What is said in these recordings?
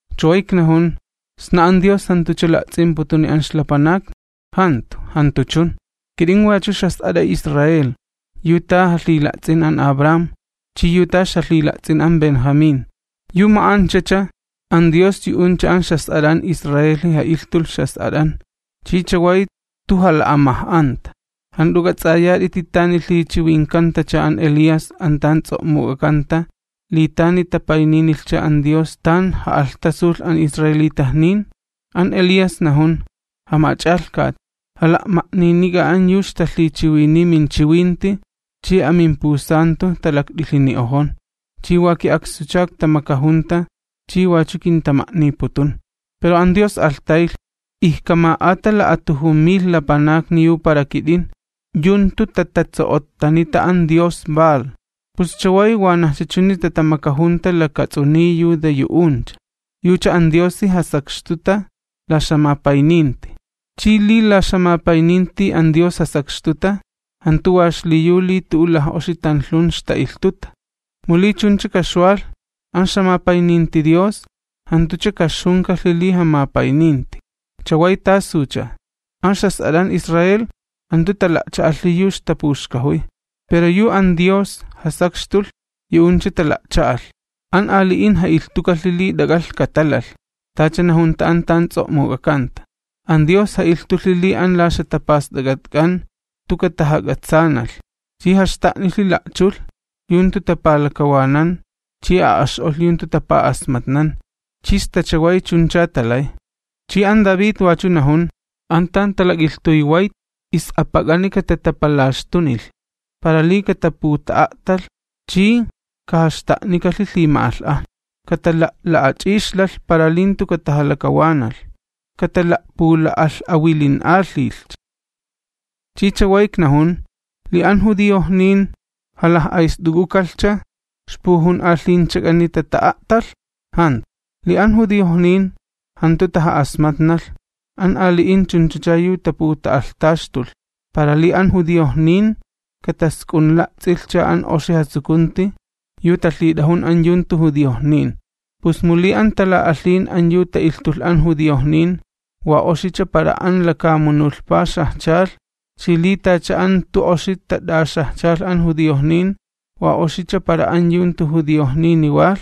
Chaway iknajun: ¿Sna an Dios jantucha jala'ts'imputuni an ixlapanakni? ¡Jantu, jantu chun! Kit'in wachu ixjas'at'a Israel, yu ta jalhila'ts'in an Abraham, chi yu ta ixjalhila'ts'in an Benjamín. Yu ma'anchacha, an Dios yu'uncha an ixjas'at'an Israelhi ja'ilhtulh ixjas'at'an, chi chaway jantu jala'amaj'anta. ¿Jant'u k'ats'ayat'iti tani lhichiwinkantacha an Elías an tan ts'o'muk'akanta, li tani tapayninilhcha an Dios tan ja'alhtasulh an Israelitajnin? An Elías najun: “Jamach'alhkat, jala'ma'ninik'a an yu ixtalhichiwiniy minchiwinti chi an tan la'ma'axta'kan lha'ulan yu milaknawin, talaklakt'ilhini'ojon, chi wa ki'akstucha iktamakajunta chi wachu kintama'niputun.” Pero an Dios alhtaylh: “Ijkama'ata la'atujun mil lapanakni yu para kit'in, yu jantu tatatso'ottanita an dios Baal.” Pus chaway wanajcha chuni tatamakajunta lakats'uniy yu yu'uncha, yucha an Diosi jasakxtuta la ixjamapayninti. Chi li la ixjamapayninti an Dios jasakxtuta, jantu wa xliyu li tu'ucha laj'oxi tanlhun ixta'ilhtuta, [mu li chuncha kaxwalh, an ixjamapayninti Dios jantucha kaxjunikalhi li jamapayninti.] ¿Chaway tasucha? An ixjas'at'an Israel jantu tala'cha'alhi yu ixtapuxkajuy. Pero yu an Dios jasakxtulh yu'uncha tala'cha'alh. An ali'in ja'ilhtukalhi li t'ak'alh katalalh, tacha najunta an tan ts'o'muk'akanta: An Dios ja'ilhtulhi li an la ixjatapast'ak'atk'an jantu katajak'atsaanalh. Chi jaxta'nilhi la'chulh yu jantu tapalakawanan chi a'ax'olh yu jantu tapa'asmatnan chi sta chaway chuncha talay. Chi an David wachu najun: An tan talak'ilhtuy wayt is'apak'ani katatapalaxtunilh, para li kataputa'a'talh chi kajaxta'nikalhi lhima'alh'ajna. Katala'la'ach'ixlalh para li jantu katajalakawanalh, katala'pula'alh'awilin'alhilhcha. Chi chaway iknajun: ¿Li an judiojnin jalaj'ayst'uk'ukalhcha, ixpujun'alhinchak'ani tata'a'talh? ¡Jantu! Li an judiojnin jantu taja'asmatnalh, an ali'in chunchacha yu taputa'alhtaxtulh, para li an judiojnin katask'unla'ts'ilhcha an oxi jatsukunti yu talhit'ajun an yu jantu judiojnin. Pus mu li an tala'alhin an yu ta'ilhtulh an judiojnin wa oxicha para an lakamunulhpa xajchalh chi li tacha an jantu oxi tat'axajchalh an judiojnin wa oxicha para an yu jantu judiojnini walh,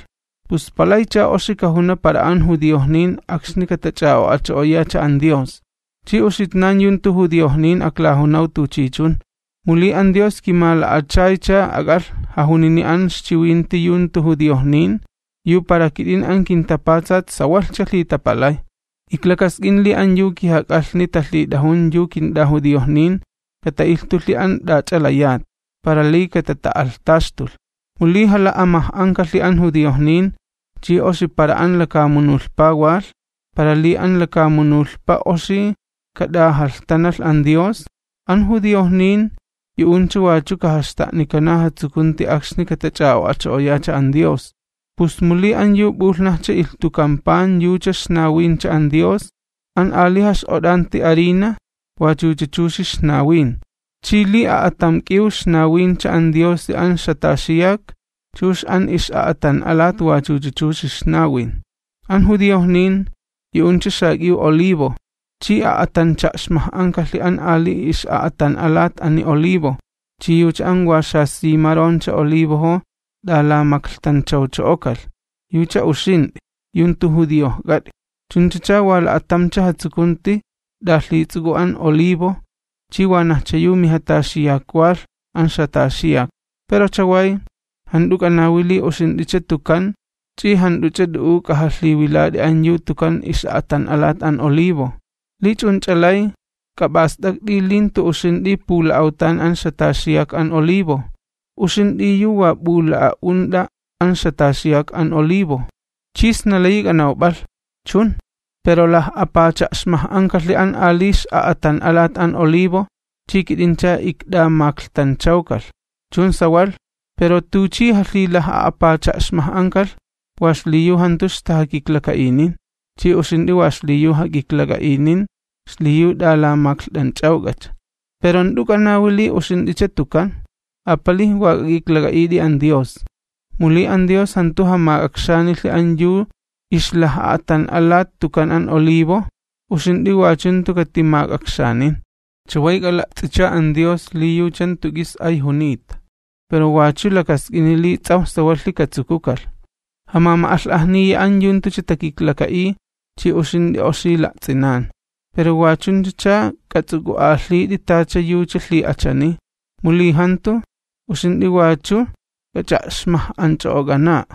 ¡pus palaycha oxi kajuna para an judiojnin akxni katach'a'o'acho'oyacha an Dios! Chi uxitnan yu jantu judiojnin aklajunaw tuchichun, mu li an Dios kimala'achaycha ak'alh jajunini an ixchiwinti yu jantu judiojnin, yu para kit'in an kintapatsat sawalhcha lhitapalay. Iklakask'in li an yu kijak'alhni talhit'ajun yu kint'ajudiojnin, kata'ilhtulhi an t'ach'a layat, para li katata'alhtaxtulh. Mu li jala'amaj'ankalhi an judiojnin, chi oxi para an lakamunulhpa walh, para li an lakamunulhpa oxi kat'ajalhtanalh an Dios, an judiojnin yu'uncha wachu kajaxta'nikana jatsukunti akxni katach'a'o'acho'oyacha an Dios. Pus mu li an yu p'ulhnajcha ilhtukan pan yucha ixnawincha Dios, an ali jax'ot'anti harina wachucha chuxi ixnawin. Chi li a'atam k'iw ixnawincha an Diosi an ixjataxiyak, chux an ix'a'atan'alat wachucha chuxi ixnawin. An judiojnin, yu'uncha xak'iw olivo, chi a'atancha'xmaj'ankalhi an ali ix'a'atan'alat ani olivo, chi yucha an wa xasimaroncha olivojo t'alamaklhtanchawcho'okalh, yucha uxint'i yu jantu judiojk'at'i. Chunchacha wa la'atamcha jatsukunti t'alhits'uk'u an olivo chi wanajcha yu mijataxiyak walh an ixjataxiyak. Pero chaway jant'u k'anawi li uxint'icha tukan ch'i jant'uch'a t'u'u k'ajalhiwilat'i an yu tukan ix'a'atan'alat an olivo. Li ch'unch'a lay, k'ap'ast'akt'i li jantu uxint'i pula'awtan an ixjataxiyak an olivo, uxint'i yu wa p'ula'a'unt'a an ixjataxiyak an olivo. Chi sna layi k'anawp'alh: “Chun, pero laj'a'apacha'xmaj'ankalhi an ali ix'a'atan'alat an olivo chi kit'incha ikt'amaklhtanchawkalh.” Chun sawalh, pero tuchi jalhilaj'a'apacha'xmaj'ankalh wa xliyu jantu ixtajakiklaka'inin, chi uxint'i wa xliyu jak'iklak'a'inin xliyu t'alamaklht'anch'awk'acha. Pero jant'u k'anawi li uxint'icha tukan, apalij wa k'ak'iklak'a'it'i an Dios. Mu li an Dios jantu jamak'akxanilhi an yu ixlaj'a'atan'alat tukan an olivo, uxint'i wachu jantu katimak'akxanin. Chaway k'ala'ts'icha an Dios li yucha jantu k'is ay junita, pero wachu lakask'ini li ts'awj sawalhi katsukukalh. Jamama'alh'ajniya an yu jantucha takiklaka'iy chi uxint'i oxi la'ts'inan. Pero wachunchacha k'ats'uk'u'alhit'i tacha yucha lhi'achani, mu li jantu, uxint'i wachu k'ach'a'xmaj'anch'o'ok'ana'a.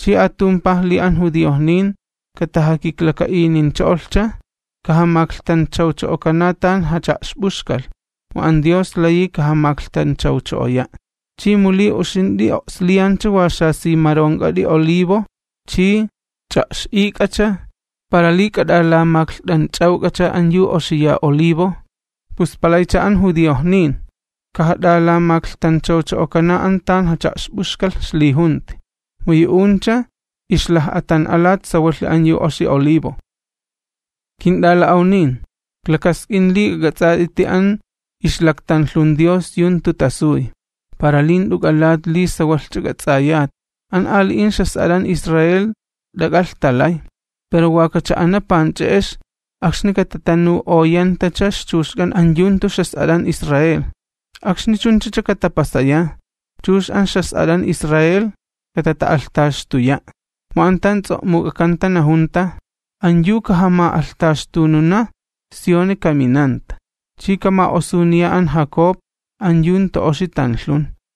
Chi atumpaj li an judiojnin katajakiklaka'inincho'olhcha, kajamaklhtanchawcho'okana tan jacha'xp'uxkalh, mu an Dios layi kajamaklhtanchawcho'oya'. Chi mu li uxint'i o'sliyancha wa xasimaronk'at'i olivo chi ch'a'x'ik'acha para li k'at'alamaklht'anch'awk'acha an yu oxiya olivo, ¡pus palaycha an judiojnin kajat'alamaklhtanchawcho'okana an tan jacha'xp'uxkalh ixlijunti, mu yu'uncha ixlaj'a'atan'alat sawalhi an yu oxi olivo. Kint'ala'awnin, iklakask'in li k'ak'ats'at'iti an ixlaktanlhun Dios yu jantu tasuy, para li jant'u k'alat li sawalhch'a k'ats'ayat, an ali'in ixjas'at'an Israel t'ak'alh talay, pero wa kacha'ana panch'e'ex akxni katatanu'oyantacha ixchuxk'an an yu jantu ixjas'at'an Israel. Akxni chunchacha katapasaya, chux an ixjas'at'an Israel katata'alhtaxtuya', mu an tan ts'o'muk'akanta najunta: An yu kajama'alhtaxtununa Sioni kaminanta, chi kama'osuniya an Jacob an yu jantu oxi tanlhun.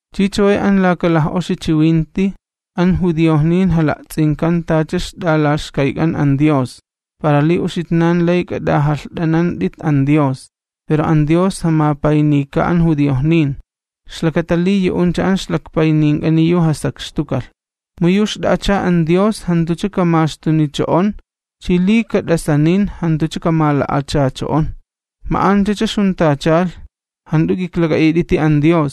Chi chaway an laka laj'oxi chiwinti, an judiojnin jala'ts'inkan tacha ixt'alaxkayk'an an Dios, para li uxitnan lay k'at'ajalht'anant'it an Dios, pero an Dios jamapaynika an judiojnin, ixlakata li yu'uncha an ixlakpaynink'ani yu jasakxtukalh. Mu yu xt'a'acha an Dios jantucha kamaxtunicho'on chi li kat'asanin jantucha kamala'achacho'on. Ma'anchacha ixjuntachalh, jant'u k'iklak'a'it'iti an Dios,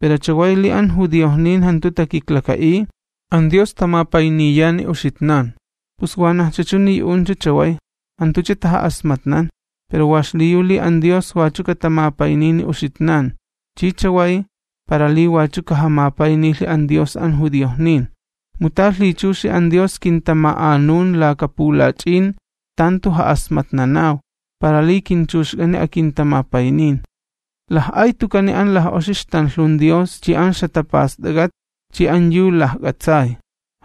pero chaway li an judiojnin jantu takiklaka'iy, an Dios tamapayniyani uxitnan. Pus wanajcha chuni yu'uncha chaway jantucha taja'asmatnan, pero wa xliyu li an Dios wachu katamapaynini uxitnan, chi chaway, para li wachu kajamapaynilhi an Dios an judiojnin. Mu ta lhichuxi an Dios kintama'anun laka pulach'in tan jantu ja'asmatnanaw, para li kinchuxk'ani akintamapaynin. ¡Laj'ay tukani an laj'oxi ixtanlhun Dios chi an ixjatapast'ak'at chi an yu lajk'atsay!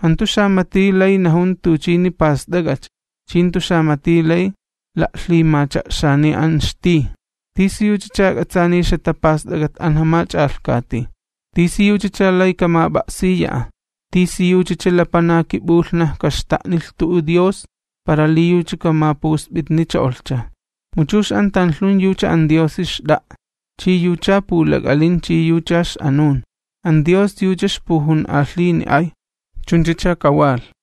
¡Jantu xamati lay najun tuchini past'ak'acha, chi jantu xamati lay la'lhimacha'xani an ixtij! ¿Tisiyuchacha k'atsaaniy ixjatapast'ak'at an Jamach'alhkati? ¿Tisi yuchacha lay kamap'a'siya'a? ¿Tisiyuchacha lapanaki p'ulhnaj kaxta'nilh tu'u Dios para li yucha kamapusp'itnicho'olhcha? Mu chux an tanlhun yucha an Diosi xt'a'a, chi yucha pulak'alin chi yucha ix'anun. ¡An Dios yucha ixpujun'alhini ay! Chunchacha kawalh.